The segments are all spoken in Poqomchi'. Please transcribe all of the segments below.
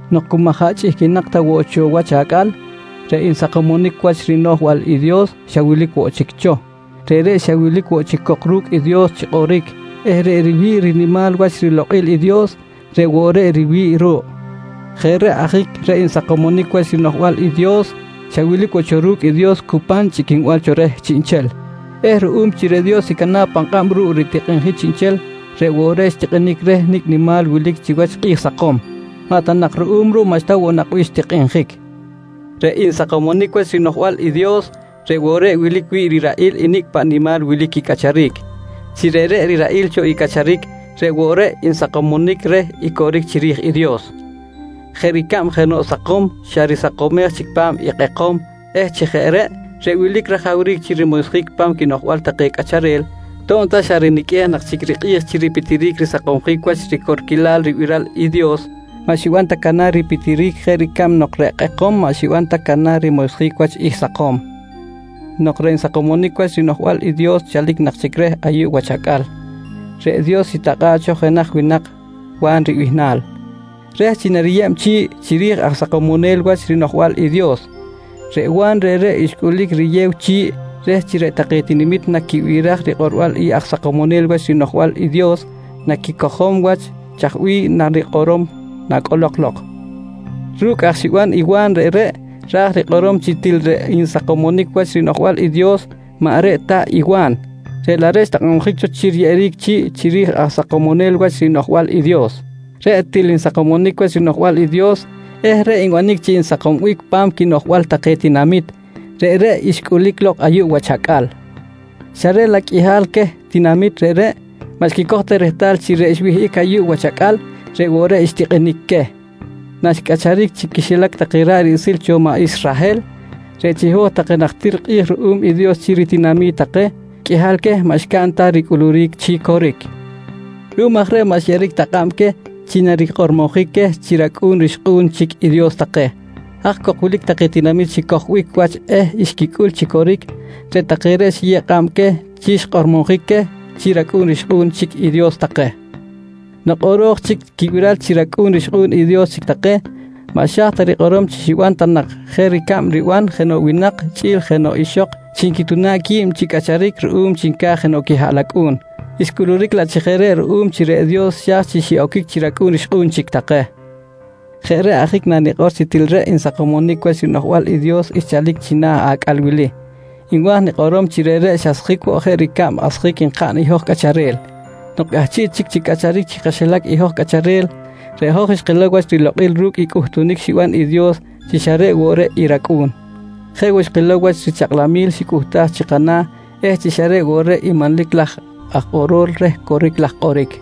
Nok cu maꞌ jaꞌ chꞌihquinak ta woꞌ cho wach acꞌal, reꞌ Nsakomonic Wach rinoꞌjbal i Dios xa wilic woꞌ chic cho. Reꞌreꞌ xa wilic woꞌ cok ru̱cꞌ i Dios chi kꞌoric eh reꞌ riwi̱ꞌ rinimal wach rilokꞌil i Dios, reꞌ woꞌ reꞌ riwi̱ꞌ ruꞌ. Jeꞌ reꞌ ajic reꞌ Nsakomonic Wach rinoꞌjbal i Dios, xa wilic woꞌ cho ru̱cꞌ i Dios cu pan chꞌiquinbal cho reh chiꞌnchel, eh ruꞌum chi reꞌ Dios xicana̱ꞌ pan kꞌab ruꞌ ritikꞌinjic chiꞌnchel, reꞌ woꞌ reꞌ xtikꞌinic reh nicꞌ nimal wilic chiwach kꞌi̱j sakom. Maꞌ ta nak ruꞌum ruꞌ, maꞌxta woꞌ nak bih xtikꞌinjic. Reꞌ Nsakomonic Wach rinoꞌjbal i Dios, reꞌ woꞌ reꞌ wilic wi̱ꞌ riraꞌil i nicꞌ paꞌ nimal wilic quicꞌacharic. Chi reꞌreꞌ riraꞌil cho i cꞌacharic, reꞌ woꞌ reꞌ nsakomonic reh i coric chiri̱j i Dios jeꞌ ricab nok jenoꞌ sakom xa risakomej chic pa̱m i kꞌekom eh chi jeꞌ reꞌ, reꞌ wilic rajawric chi rimoysjic pa̱m quinoꞌjbal take cꞌacharel, to̱b ta xa riniqꞌuej nak chic rikꞌi̱j chi ripitiric risakomsjic wach ricorquilal ribiral i Dios, maꞌ xiban ta canar ripitiric jeꞌ ricab nok reꞌ kꞌekom maꞌ xiban ta canar rimoysjic wach i sakom. Nok reꞌ Nsakomonic Wach rinoꞌjbal i Dios chalic nak chic reh ayuꞌ wach acꞌal, reꞌ Dios xitakꞌa̱ꞌ cho jenaj winak Wa̱n ribihnal reh chi nariyeb chi̱ꞌ chiri̱j Aj Sakomonel Wach rinoꞌjbal i Dios. Reꞌ Wa̱n reꞌreꞌ xcꞌulic riyew chi̱ꞌ reh chi reꞌ take tinamit naquibiraj rikꞌorbal i Aj Sakomonel Wach rinoꞌjbal i Dios naquicojom wach chaj bih narikꞌorom nacꞌolok lok. Ru̱cꞌ aj xiban i Wa̱n reꞌreꞌ, ra̱j rikꞌorom chi til reꞌ Nsakomonic Wach rinoꞌjbal i Dios maꞌ reꞌ ta i Wa̱n, reꞌ laꞌ reꞌ xtakꞌabjic cho chi riyeꞌeric chi̱ꞌ chiri̱j Aj Sakomonel Wach rinoꞌjbal i Dios. Reꞌ til Nsakomonic Wach rinoꞌjbal i Dios eh reꞌ nbanic chi nsakombic pa̱m quinoꞌjbal take tinamit, reꞌreꞌ xcꞌulic lok ayuꞌ wach acꞌal, xa reꞌ laꞌ qꞌuihal queh tinamit reꞌreꞌ maꞌ xquicoj ta rehtal chi reꞌ xwihꞌic ayuꞌ wach acꞌal, reꞌ woꞌ reꞌ xtikꞌinic queh. Naxcꞌacharic chi quixilac take ra̱ꞌ riꞌsil cho maꞌ Israhel reꞌ chiho̱j take najtir kꞌi̱j ruꞌum i Dios chi ritinami̱t take, qꞌuihal queh maꞌ xcaꞌn ta ricꞌuluric chi coric. Ruꞌum aj reꞌ maꞌ xyeꞌeric ta kꞌab queh chi narikꞌormojic queh chi racꞌu̱n rixkꞌu̱n chic i Dios take. Haj cok wilic take tinamit xicojbic wach eh xquicꞌul chi coric, reꞌ take reꞌ xiyew kꞌab queh chi xkꞌormojic queh chi racꞌu̱n rixkꞌu̱n chic i Dios take. Nok kꞌoro̱j chic quibiral chi racꞌu̱n rixkꞌu̱n i Dios chic take, maꞌ xa̱j ta rikꞌorom chi xiban ta nak jeꞌ ricab riban jenoꞌ winak chꞌi̱l jenoꞌ ixok chi nquituna̱b qui̱b chi cꞌacharic ruꞌum chi nca̱j jenoꞌ quihaꞌlacꞌu̱n, xcꞌuluric laꞌ chi jeꞌ reꞌ ruꞌum chi reꞌ Dios xa̱j chi xiꞌoquic chi racꞌu̱n rixkꞌu̱n chic take. Jeꞌ reꞌ ajic nanikꞌor chi til reꞌ Nsakomonic Wach rinoꞌjbal i Dios xchalic china̱ acꞌal wili, nwa̱j nikꞌorom chi reꞌreꞌ xasjic woꞌ jeꞌ ricab asjic nkaꞌn i hoj cꞌacharel. Nok cꞌahchiꞌ chic chi cꞌacharic chi kaxilac i hoj cꞌacharel, reꞌ hoj xkilow wach rilokꞌil ru̱cꞌ i cꞌuhtunic xiban i Dios chi xa reꞌ woꞌ reꞌ i rAcꞌu̱n. Jeꞌ woꞌ xkilow wach richakꞌlamil xicꞌuhtaj chi kana̱ eh chi xa reꞌ woꞌ reꞌ i manlic laj Aj Kꞌorol reh coric laj kꞌoric.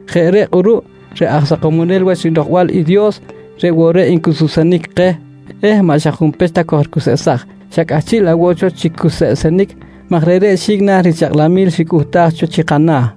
Jeꞌ reꞌ kꞌuruꞌ reꞌ Aj Sakomonel Wach rinoꞌjbal i Dios reꞌ woꞌ reꞌ ncuseꞌsenic keh eh maꞌ xa junpech ta kojricuseꞌsaj xa cꞌahchiꞌ laꞌ woꞌ cho chi cuseꞌsenic maj reꞌreꞌ xi̱cꞌ na̱ richakꞌlamil ricꞌuhtaj cho chi kana̱.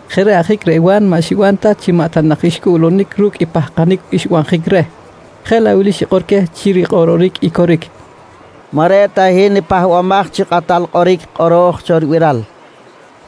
Jeꞌ reꞌ ajic reꞌ Wa̱n maꞌ xiban ta chi maꞌ ta nak xcꞌuꞌlunic ru̱cꞌ i pahkanic xbanjic reh, jeꞌ laꞌ wili xikꞌor queh chi rikꞌororic i coric: «Maꞌ reꞌ ta hin i Pahbamaj chi Kꞌatal Kꞌoric kꞌoro̱j cho ribiral, nqui queh.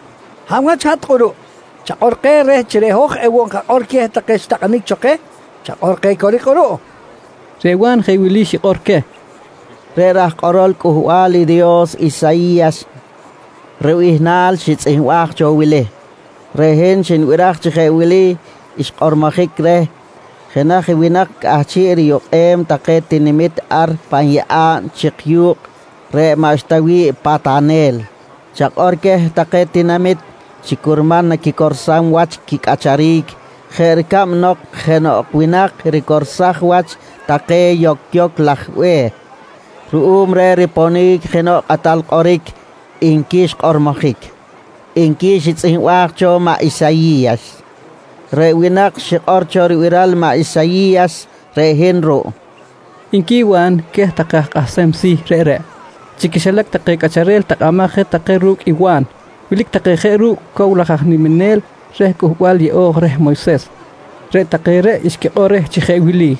«Hab wach i hat kꞌuruꞌ, chakꞌor keh reh chi reꞌ hoj ewoꞌ enkakꞌor queh take xitakꞌanic cho keh. Chakꞌor keh coric kꞌuruꞌ, nqui take reh. Reꞌ Wa̱n jeꞌ wili xikꞌor queh: «Reꞌ raj kꞌorol Cꞌuhbal i Dios Isayi̱yas ribihnal xitzꞌihmbaj cho i wili: “Reꞌ hin xnibiraj chi jeꞌ wili xkꞌormojic reh jenaj winak cꞌahchiꞌ riyukꞌem take tinamit ar pan yeꞌa̱b chik yu̱kꞌ reꞌ maꞌxta wi̱ꞌ patanel: ‘Chakꞌor queh take tinamit chi curman naquicorsam wach quicꞌacharic jeꞌ ricab nok jenoꞌ winak ricorsaj wach take yocyoc laj be̱h ruꞌum reh riponic jenoꞌ kꞌatal kꞌoric, nqui xkꞌormojic, nqui xitzꞌihmbaj cho maꞌ Isayi̱yas. «Reꞌ winak xikꞌor cho ribiral i maꞌ Isayi̱yas reꞌ hin ruꞌ, nqui Wa̱n queh take aj kꞌahsem si̱ reꞌreꞌ. Chi quixilac take cꞌacharel takꞌamaj je take ru̱cꞌ i Wa̱n, wilic take jeꞌ ru̱cꞌ cow laj aj niminel reh Cꞌuhbal Yeꞌo̱j reh Moyses. Reꞌ take reꞌ xquikꞌor reh chi jeꞌ wili: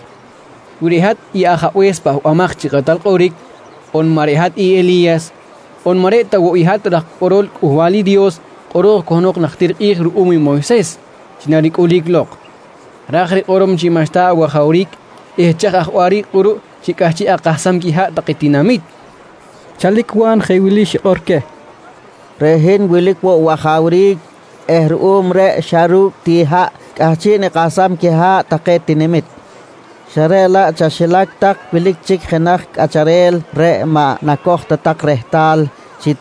«Wi maꞌ reꞌ hat i Ajabe̱s Pahbamaj chi Kꞌatal Kꞌoric on maꞌ reꞌ hat i Eli̱yas on maꞌ reꞌ ta woꞌ hat i raj kꞌorol Cꞌuhbal i Dios kꞌoro̱j cahnok najtir kꞌi̱j ruꞌum i Moyses chi naricꞌulic lok, ra̱j rikꞌorom chi maꞌxta awajawric eh chaj aj waꞌric kꞌuruꞌ chi cꞌahchiꞌ akahsam quiha̱ꞌ take tinamit, nqui take reh. Chalic Wa̱n jeꞌ wili xikꞌor queh: «Reꞌ hin wilic woꞌ wajawric eh ruꞌum reꞌ xa ru̱cꞌ ti haꞌ cꞌahchiꞌ nikahsam quiha̱ꞌ take tinamit, xa reꞌ laꞌ chaxilac tak wilic chic jenaj cꞌacharel reꞌ maꞌ nacoj ta tak rehtal chi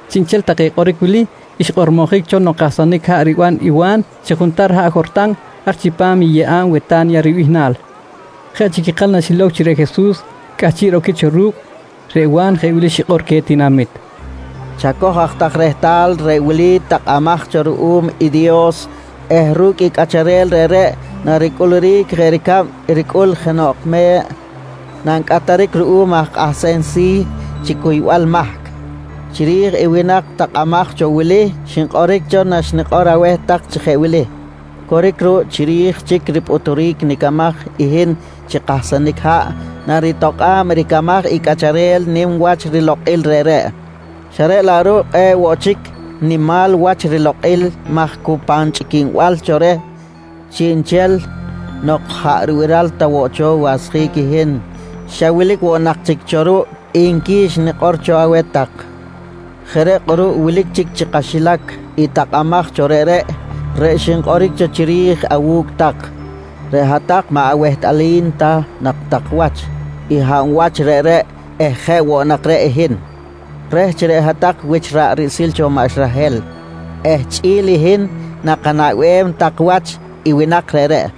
Chiꞌnchel take kꞌoric wili xkꞌormojic cho nok kahsanic haꞌ riban i Wa̱n chi juntar haꞌ Jortan, ar chipam i yeꞌa̱b Weta̱nya ribihnal. Jeꞌ chic ikal naxilow chi reꞌ Jesus cꞌahchiꞌ roquic cho ru̱cꞌ, reꞌ Wa̱n jeꞌ wili xikꞌor queh tinamit: «Chacoj aj tak rehtal: Reꞌ wili i takꞌamaj cho ruꞌum i Dios eh ru̱cꞌ i cꞌacharel reꞌreꞌ naricꞌuluric jeꞌ ricab ricꞌul jenoꞌ me̱ꞌ nancꞌatjic ruꞌum aj kꞌahsem si̱ chi cuybal mahc. Chiri̱j i winak takꞌamaj cho wili xinkꞌoric cho naxnikꞌor aweh tak chi jeꞌ wili: ‹Coric ruꞌ, chiri̱j chic ripꞌuturic nicamaj i hin chi kahsanic haꞌ, naritokꞌa̱b ricamaj i cꞌacharel nim wach rilokꞌil reꞌreꞌ, xa reꞌ laꞌ ruꞌ kꞌe̱ꞌ woꞌ chic nimal wach rilokꞌil maj cu pan chꞌiquinbal cho reh chiꞌnchel nok jaꞌ ribiral ta woꞌ cho wasjic i hin, xa wilic woꞌ nak chic cho ruꞌ, nqui xnikꞌor cho aweh tak. «Jeꞌ reꞌ kꞌuruꞌ wilic chic chi kaxilac i takꞌamaj cho reꞌreꞌ, reꞌ xinkꞌoric cho chiri̱j awu̱cꞌ tak. Reꞌ hat-tak maꞌ awehtꞌalim ta nak tak wach i hab wach reꞌreꞌ eh jeꞌ woꞌ nak reꞌ i hin. Reh chi reꞌ hat-tak wich ra̱ꞌ riꞌsil cho maꞌ Israhel eh chꞌi̱l i hin nakanaꞌbem tak wach i winak reꞌreꞌ,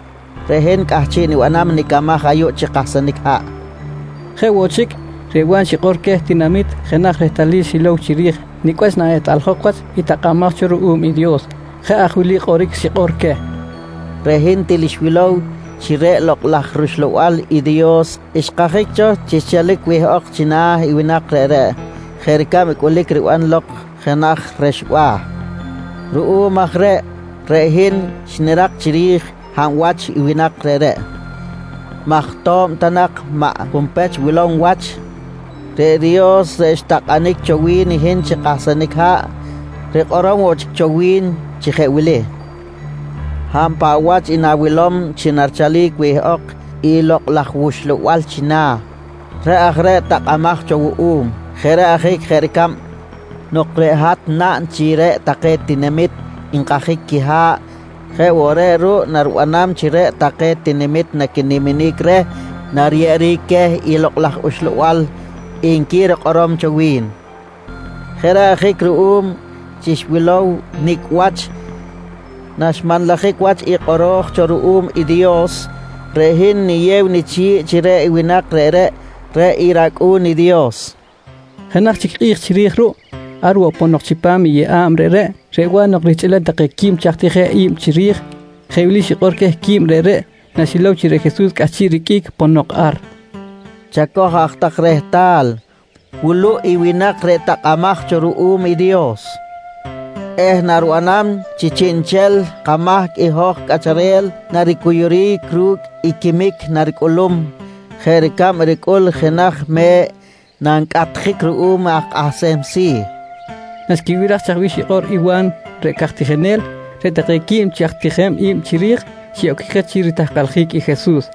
reꞌ hin cꞌahchiꞌ nibanam nicamaj ayuꞌ chi kahsanic haꞌ, nqui Wa̱n. Jeꞌ woꞌ chic, reꞌ Wa̱n xikꞌor woꞌ queh tinamit jenaj rehtalil xilow chiri̱j nicꞌ wach naꞌehtꞌaljok wach i takꞌamaj cho ruꞌum i Dios. Jeꞌ aj wili kꞌoric xikꞌor queh: «Reꞌ hin til xwilow chi reꞌ Lokꞌ laj rUxlabal i Dios xkajic cho chi xchalic wihꞌok china̱ i winak reꞌreꞌ jeꞌ ricab i cꞌulic riban lok jenaj rexba̱. Ruꞌum aj reꞌ, reꞌ hin xnirak chiri̱j hab wach i winak reꞌreꞌ maj to̱b ta nak maꞌ junpech wilom wach, reꞌ Dios reꞌ xtakꞌanic woꞌ cho wi̱n i hin chi kahsanic haꞌ, rikꞌorom woꞌ chic cho wi̱n chi jeꞌ wili: ‹Hab paꞌ wach i na̱wilom chi narichalic wihꞌok i Lokꞌ laj wUxlabal china̱, reꞌ aj reꞌ i takꞌamaj cho wuꞌum. Jeꞌ reꞌ ajic jeꞌ ricab nok reꞌ hat naꞌn chi reꞌ take tinamit nkajic quiha̱ꞌ jeꞌ woꞌ reꞌ ruꞌ naribanam chi reꞌ take tinamit naquiniminic reh nariyeꞌeric queh i Lokꞌ laj Uxlabal, nqui rikꞌorom cho wi̱n. «Jeꞌ reꞌ ajic ruꞌum chi xwilow nicꞌ wach naxmanlajic wach i kꞌoro̱j cho ruꞌum i Dios, reꞌ hin niyew nichi̱ꞌ chi reꞌ winak reꞌreꞌ, reꞌ i rAcꞌu̱n i Dios, nqui Wa̱n. Jenaj chic kꞌi̱j chiri̱j ruꞌ, ar woꞌ ponok chipam i yeꞌa̱b reꞌreꞌ, reꞌ Wa̱n nok rihchꞌilem take quib chi aj tijem i̱b chiri̱j, jeꞌ wili xikꞌor queh quib reꞌreꞌ naxilow chi reꞌ Jesus cꞌahchiꞌ riqꞌuic ponok ar: «Chacoj aj tak rehtal, wuluꞌ i winak reꞌ takꞌamaj cho ruꞌum i Dios eh naribanam chi chiꞌnchel kamahc i hoj cꞌacharel naricuyuric ru̱cꞌ i quimic naricꞌulum jeꞌ ricab ricꞌul jenaj me̱ꞌ nancꞌatjic ruꞌum aj kꞌahsem si̱, nqui Wa̱n. Naxquibiraj chaj bih xikꞌor i Wa̱n reꞌ caj tijinel, reꞌ take quib chi aj tijem i̱b chiri̱j xiꞌoquic je chi ritahkaljic i Jesus,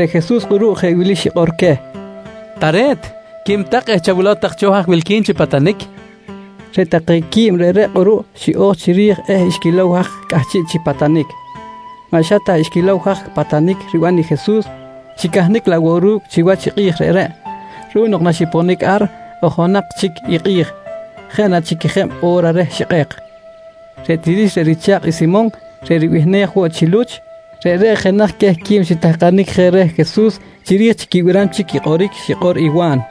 Reꞌ Jesus kꞌuruꞌ jeꞌ wili xikꞌor queh: «Tare̱t, quim tak eh chawilow tak cho haj wilqui̱n chi patanic, nqui queh. Reꞌ take quib reꞌreꞌ kꞌuruꞌ xiꞌo̱j chiri̱j eh xquilow haj cꞌahchiꞌ chi patanic. Maꞌ xa ta xquilow haj patanic riban i Jesus, xicahnic laꞌ woꞌ ru̱cꞌ chiwach i kꞌi̱j reꞌreꞌ ruꞌum nok naxiponic ar ojonak chic i kꞌi̱j, jeꞌ na chic quejeb o̱ra reh xikꞌek. Reꞌ Tirix reꞌ richa̱kꞌ i Simon reꞌ ribihnej woꞌ chi Luch, reꞌreꞌ jenaj queh quib xitahkanic je reh Jesus chiri̱j chi quibiram chic i kꞌoric xikꞌor i Wa̱n.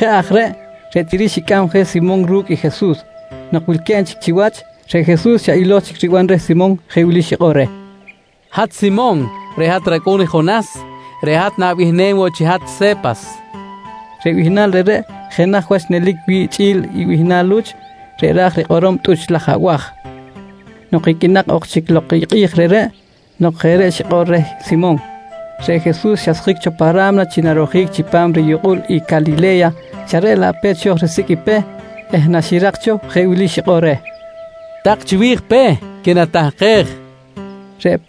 Jeꞌ aj reꞌ, reꞌ Tirix xicꞌam je Simon ru̱cꞌ i Jesus. Nok wilque̱b chic chiwach, reꞌ Jesus xa ilo̱j chic riban reh Simon jeꞌ wili xikꞌor reh: «Hat Simon reꞌ hat racꞌu̱n i Jonas, reꞌ hat na̱bihnem woꞌ chi hat Se̱pas, nqui reh. Reꞌ bihnal reꞌreꞌ jenaj wach nelic wi̱ꞌ chꞌi̱l i bihnal Luch reꞌ ra̱j rikꞌorom “tꞌuch laj abaj”. Nok iqꞌuinak ok chic lok i kꞌi̱j reꞌreꞌ nok jeꞌ reꞌ xikꞌor reh Simon, reꞌ Jesus xasjic cho pa ra̱mna chi narojic chipam riyukꞌul i Calile̱ya, xa reꞌ laꞌ pe̱t xo̱j risicꞌ i Peh eh naxirak cho jeꞌ wili xikꞌor reh: «Tak chiwi̱j Peh quinatahkej, nqui reh.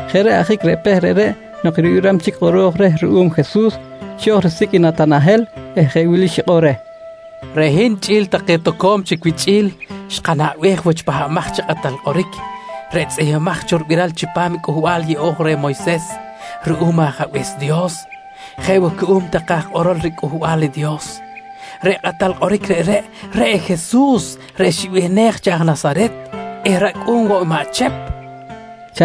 Jeꞌ reꞌ ajic reꞌ Peh reꞌreꞌ nok ribiram chic i kꞌoro̱j reh ruꞌum Jesus, xo̱j risicꞌ i Natanahel eh jeꞌ wili xikꞌor reh: «Reꞌ hin chꞌi̱l take toco̱m chic wichꞌi̱l xkanaꞌbej wach i Pahbamaj chi Kꞌatal Kꞌoric, reꞌ tzꞌihmbimaj cho ribiral chipam Cꞌuhbal yeꞌo̱j reh Moyses ruꞌum i Ajabe̱s Dios jeꞌ woꞌ cuꞌum take aj kꞌorol riCꞌuhbal i Dios. Reꞌ Kꞌatal Kꞌoric reꞌreꞌ, reꞌ i Jesus reꞌ ribihnej chi “aj Nasaret” eh racꞌu̱n woꞌ i maꞌ Chep, nqui reh.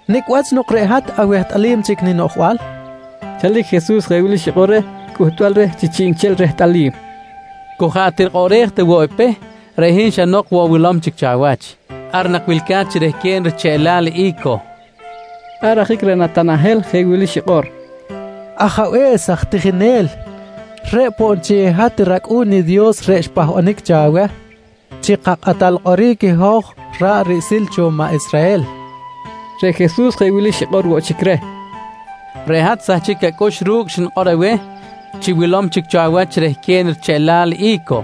—Nicꞌ wach nok reꞌ hat awehtꞌalim chic ninoꞌjbal? nqui Natanahel reh Jesus. Chalic Jesus jeꞌ wili xikꞌor reh cꞌuhtbal reh chi chiꞌnchel rehtꞌalim: «Cu jaꞌ tirikꞌoꞌrej ta woꞌ i Peh, reꞌ hin xa nok woꞌ wilom chic cho awach. Ar nak wilca̱t chi rehquen richeꞌlal i̱co, nqui reh. Ar ajic reꞌ Natanahel jeꞌ wili xikꞌor: «Ajabe̱s aj tijinel, reꞌ poꞌ nchel i hat rAcꞌu̱n i Dios reꞌ xpahbanic cho aweh chi kaKꞌatal Kꞌoric i hoj ra̱ꞌ riꞌsil cho maꞌ Israhel! nqui reh. Reꞌ Jesus jeꞌ wili xikꞌor woꞌ chic reh: «Reꞌ hat xsahchic acꞌux ru̱cꞌ xnikꞌor aweh chi wilom chic cho awach chi rehquen richeꞌlal i̱co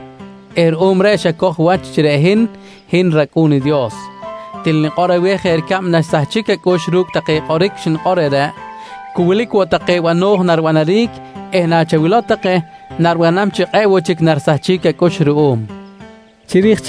eh ruꞌum reꞌ xacoj wach chi reꞌ hin, hin rAcꞌu̱n i Dios. Til nikꞌor aweh jeꞌ ricab naxsahchic acꞌux ru̱cꞌ take kꞌoric xnikꞌor reꞌreꞌ, cu wilic woꞌ take bano̱j naribanaric eh nachawilow take, naribanam chi kꞌe̱ꞌ woꞌ chic narisahchic acꞌux ruꞌum, nqui Jesus reh Natanahel.